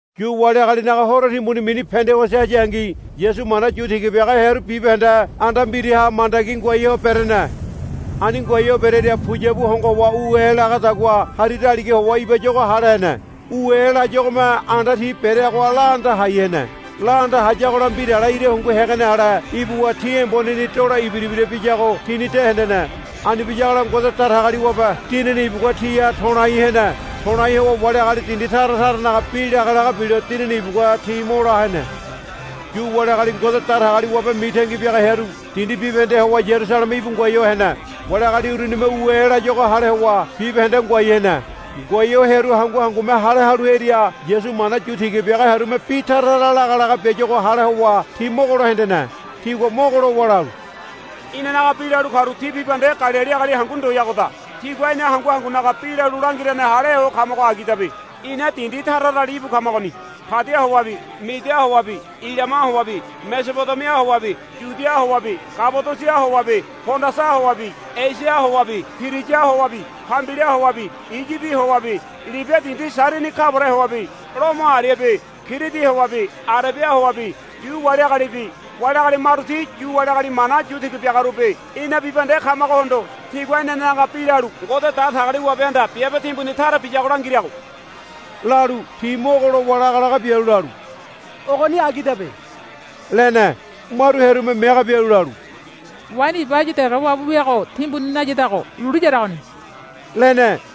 Yu wali agalinaga horo timbuni mini Pendigosi hayangi Yasu mana yu tiga biaga hearu bibahende anda mbiraha mandagi ngoai ho berene. Ani ngoai ho berearia puyabu hongo howa u e lagadagua hari daliga howa ibayuago hale hene. U e layuagome anda ti bereagoha laanda hai hene. Laanda hayagola mbirale ira hungu hegene ale ibuwa ti emboneni dolo ibira ibira biyago tini de hendene. Ani biyagola Ngode Datagaliwabe Dinini ibugua tiha to̱lai hene. To̱lai howa wali agali dindi tara taranaga bi lagalaga bilo Dinini ibugua ti mo la hene. Yu wali agali Ngode Datagaliwabe mitangi biaga hearu dindi bibahendeha howa Yarusaleme íbu ngoai ho hene. Wali agali urunime u e layuago hale howa bibahende ngoai hene. Ngoai ho hearu hangu hangume hale halu hearia Yasu mana yu tiga biaga hearume bi taratara lagalaga biayuago hale howa ti mogolo hendene. Tigua mogo lowa lalu, Inanaga bi lalu karu ti bibahende Galili agali hangu ndoyagoda. Tigua ina hangu hangunaga bi lalu langirane haleho kamago agidabe. Ina dindi tara tarali íbu kamagoni. Padia howabi Midia howabi Ilama howabi Mesobodemia howabi Yudia howabi Kabadosia howabi Pondasa howabi Esia howabi Piriya howabi Pambilia howabi Iyibi howabi Libia dindi Sairini kaware howabi Lomo ariabi Kiridi howabi Arebia howabi Yu wali agalibi wali agali maru ti Yu wali agali mana yu tiga biagarubi ina bibahende kamagohondo tigua inanenaga bi lalu Ngode Datagaliwabehanda biabe timbuni tara biyago langirago, lalu ti mogo lowa lagalaga bialu lalu, Ogoni agidabe, lene. Maru hearume mege bialu lalu, Waini iba áyu dege wabu wiago timbuni nayadago lulu yaragoni, lene.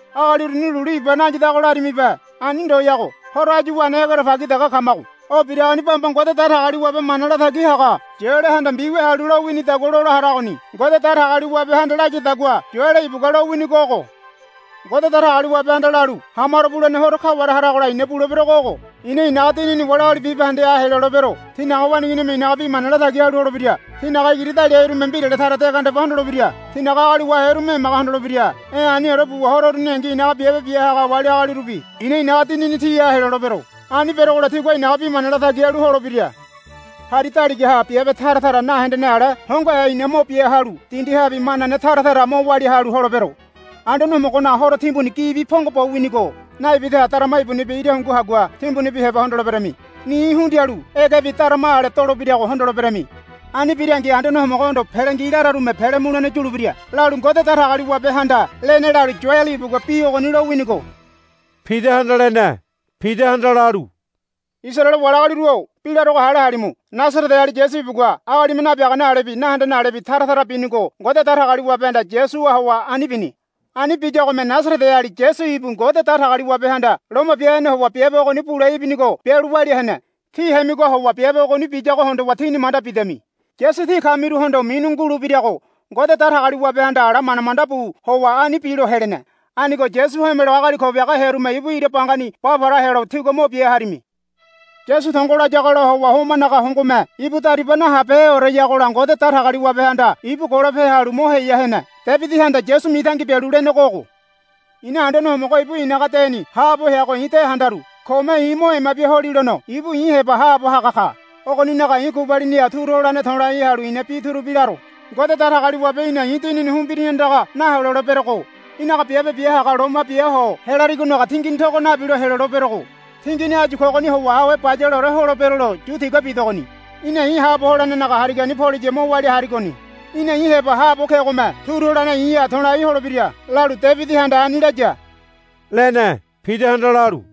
Agali uruni lulu iba nayadago larimibe. Ani ndoyago. Horo áyu wene egerebagi dege kamago. O biragoni bamba Ngode Datagaliwabe mana latagi haga Yoelehanda mbiwia halu lowinidagua lola haragoni. Ngode Datagaliwabehanda layadagua Yoele ibugua lowinigo ogo, Ngode Datagaliwabehanda lalu, Ha maro bulene horo kaware haragola i̱na buleberogo ogo. I̱na i̱naga Dinini wali agali bibahendeha helolebero. Tínaga waneiginime i̱naga bi mana latagi halu holebira. Tínaga igiri daliaherume mbirale tara de gandeba hondolebira. Tínaga agali waherume emaga hondolebira. E̱ aniore buwa horo uruningi i̱naga biabe bia haga wali agalirubi i̱na i̱naga Dinini tiha helolebero. Ani berogola tigua i̱naga bi mana latagi halu holebira. Hari daligaha biabe tara tara nahendene ale hongohe i̱na mo bia halu dindihabi manane tara tara mo walia halu holebero. Anduane Homogonaga Horo timbuni gibi pongo bo winigo naibidaha darama ibunibi ira hungu hagua timbunibi heba hondoleberami. Ni hundialu egebi darama ale dolebirago hondoleberami. Ani birangi Anduane Homogohondo, Pele ngi, lararume pele mulene yulebira, lalu, Ngode Datagaliwabehanda lene lalu Yoele ibugua bi ogoni lowinigo, Pidahanda lene. Pidahanda lalu, Isaraele wali agaliru-o bi larogo hale halimu. Nasareteali Yasu ibugua agalime nabiagane alebi nahendene alebi taratara binigo Ngode Datagaliwabehanda Yasuha howa ani bini. Ani biyagome Nasareteali Yasu ibu Ngode Datagaliwabehanda loma bia hene howa biabe ogoni bule ibinigo bialu walia hene. Tí hemigoha howa biabe ogoni biyago hondowa tíni manda bidami. Yasu tí kamiruhondo minu ngulebirago Ngode Datagaliwabehanda ala manda manda bu howa ani bilo helene. Anigo Yasu homelo agali ko biaga hearume ibu ira bangani ba para helo tígua mo bia harimi. Yasu tongo layagola howa homanaga hongome ibu dariba nahabeheoreyagola Ngode Datagaliwabehanda ibu golope halu mo heya hene. Debidihanda Yasu mitangi bialu lenego ogo, I̱na Anduane Homogo ibu i̱naga deni haabo heago i̱ de handaru. Kome i̱ mo ema bia holilono ibu i̱ heba haabo haga ka. Ogoninaga i̱ gubaliniha turu holene to̱lai halu i̱na bi turubi laro. Ngode Datagaliwabe í̠na i̱ dinini humbirini andaga naheloleberego. Í̠naga biabe bia haga loma biaho helarigonaga tingini togo nabilo heloleberego. Tingini áyu kogoni howa awe bayaleore holebero lo yu tiga bidogoni. Í̠na i̱ haabo holenenaga harigani poliya mo walia harigoni. Í̠na i̱ heba haabo kegome turu holene i̱ha to̱lai holebira, lalu Debidihanda ani laya, lene. Pidahanda lalu,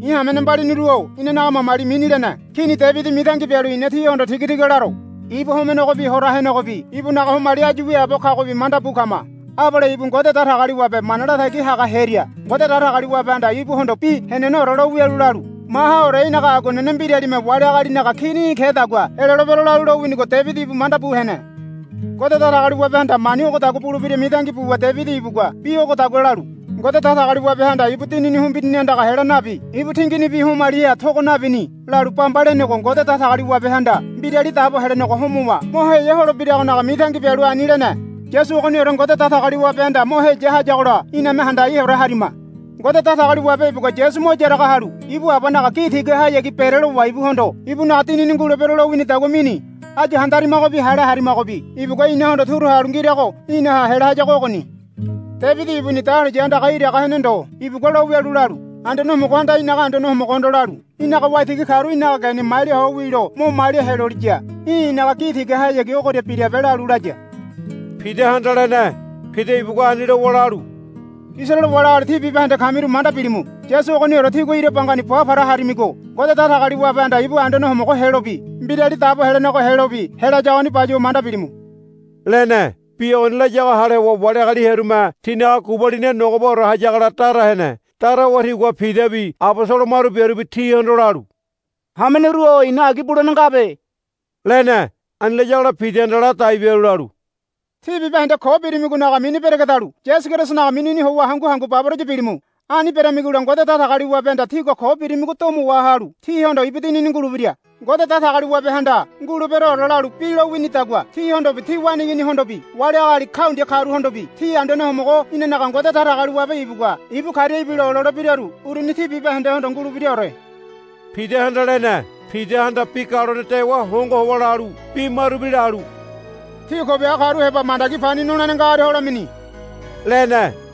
I̱ hamene mbaliniru-o inanaga mamali mini lene Kini Debidi mitangi bialu i̱na tíhondo tigatiga laro. Ibu homenegobi hora henegobi ibunaga homali áyu wiaabo kagobi manda bu kama. Abale ibu Ngode Datagaliwabe mana latagi haga hearia Ngode Datagaliwabehanda ibuhondo bi heneneore lo wialu lalu, Mahaore í̠naga aguanene mbiralime wali agalinaga kini í̠ kedagua helolebero, lalu lowinigo Debidi ibu manda bu hene. Ngode Datagaliwabehanda mani ogodagua bulebira mitangi buwa Debidi ibugua bi ogodagua lalu, Ngode Datagaliwabehanda ibu dinini humbirini andaga hela nabi ibu tinginibi homaliha togo nabini, lalu bamba lenego Ngode Datagaliwabehanda Mbirali Dabo Helenego homowa mo heya holebiragonaga mitangi bialu ani lene. Yasu ogoniore Ngode Datagaliwabehanda mo heya hayagola iname handaiore harima. Ngode Datagaliwabe ibugua Yasu mo yaraga halu ibu Abanaga gi tigahayagi berelowa ibuhondo ibunaga Dinini ngulebero lowinidagua mini. Áyu handaramigobi hale haramigobi ibugua inahondo turu halu ngirago inaha hela hayago ogoni. Debidi ibuni dahuliya andaga iraga hene ndo ibugua lowialu lalu, Anduane Homogohanda i̱naga Anduane Homogohondo lalu, Í̠naga waitigi karu í̠naga geni malia ho wilo mo malia heloliya í̠ i̱naga gi tigahayagi ogoria birabe, lalu laya, Pidahanda lene. Pida ibugua ani lowa lalu, Isaraele wali agali tí bibahende kamiru manda bilimu. Yasu ogoniore tígua ira bangani ba para harimigo Ngode Datagaliwabehanda ibu Anduane Homogo helobi Mbirali Dabo Helenego helobi helayagoni bayuwa manda bilimu, lene. Bi ogoni layago hale howa wali agali hearume tinaga gubaliniha nogobaore hayagola dara hene. Dara howa tigua Pidabi abosolo maru biarubi tihondo lalu, Hameneru-o ina agi bulene ngabe, lene. Ani layagola Pidahanda ladai bialu lalu, Tí bibahende ko birimigonaga mini beregedalu Yasu Kerisonaga minini howa hangu hangu baboraya bilimu. Ani beramigola Ngode Datagaliwabehanda tígua ko birimigo domo wahalu tíhondo ibu Dinini ngulebira. Ngode Datagaliwabehanda, Nguleberoore, lalu bi lowinidagua tíhondobi tí waneiginihondobi wali agali kaundia karuhondobi ti Anduane Homogo inanaga Ngode Datagaliwabe ibugua ibu karia ibilo ololebiraru uruni ti bibahendehondo ngulebiraore, Pidahanda lene. Pidahanda bi galone dewa hongo howa lalu bi marubi lalu, Tí ko biaga karu heba mandagi pani nolene ngagoria holemini, lene.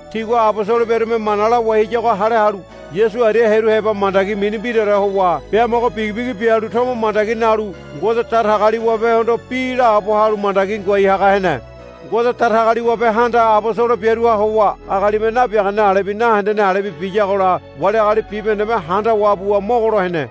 Tigua abosolo biarume mana lawai hayago hale halu Yasu aria hearu heba mandagi mini mbiraore howa biamogo bigibigi bialu tomo mandagi nalu Ngode Datagaliwabehondo bi laabo halu mandagi ngoai haga hene. Ngode Datagaliwabehanda abosolo biaruha howa agalime nabiagane alebi nahendene alebi biyagola wali agali bibahendeme handawa buwa mogolo hene.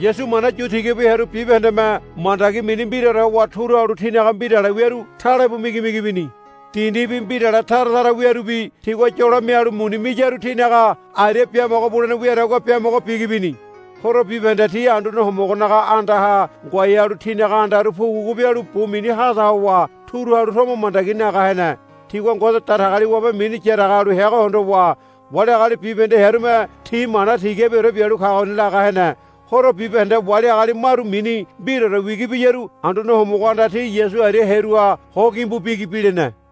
Yasu mana yu tiga bu hearu bibahendeme mandagi mini mbiraore howa turu halu tinaga mbirale wiaru talebu migimigi bini. Dindibi mbirale taratara wiarubi tigua yolo mialu muni miyaru tinaga aria biamogo bulene wiadagua biamogo bigi bini. Horo bibahende ti Anduane Homogonaga andaha ngoai halu tinaga andaru pugupugu bialu bu mini hada howa turu halu tomo mandagi naga hene. Tigua Ngode Datagaliwabe mini yaraga halu heago hondowa wali agali bibahende hearume ti mana tigabiore bialu kagoni laga hene. Horo bibahende wali agali maru mini mbiraore wigi biyaru Anduane Homogohanda ti Yasu aria hearuha ho gimbu bigi bilene.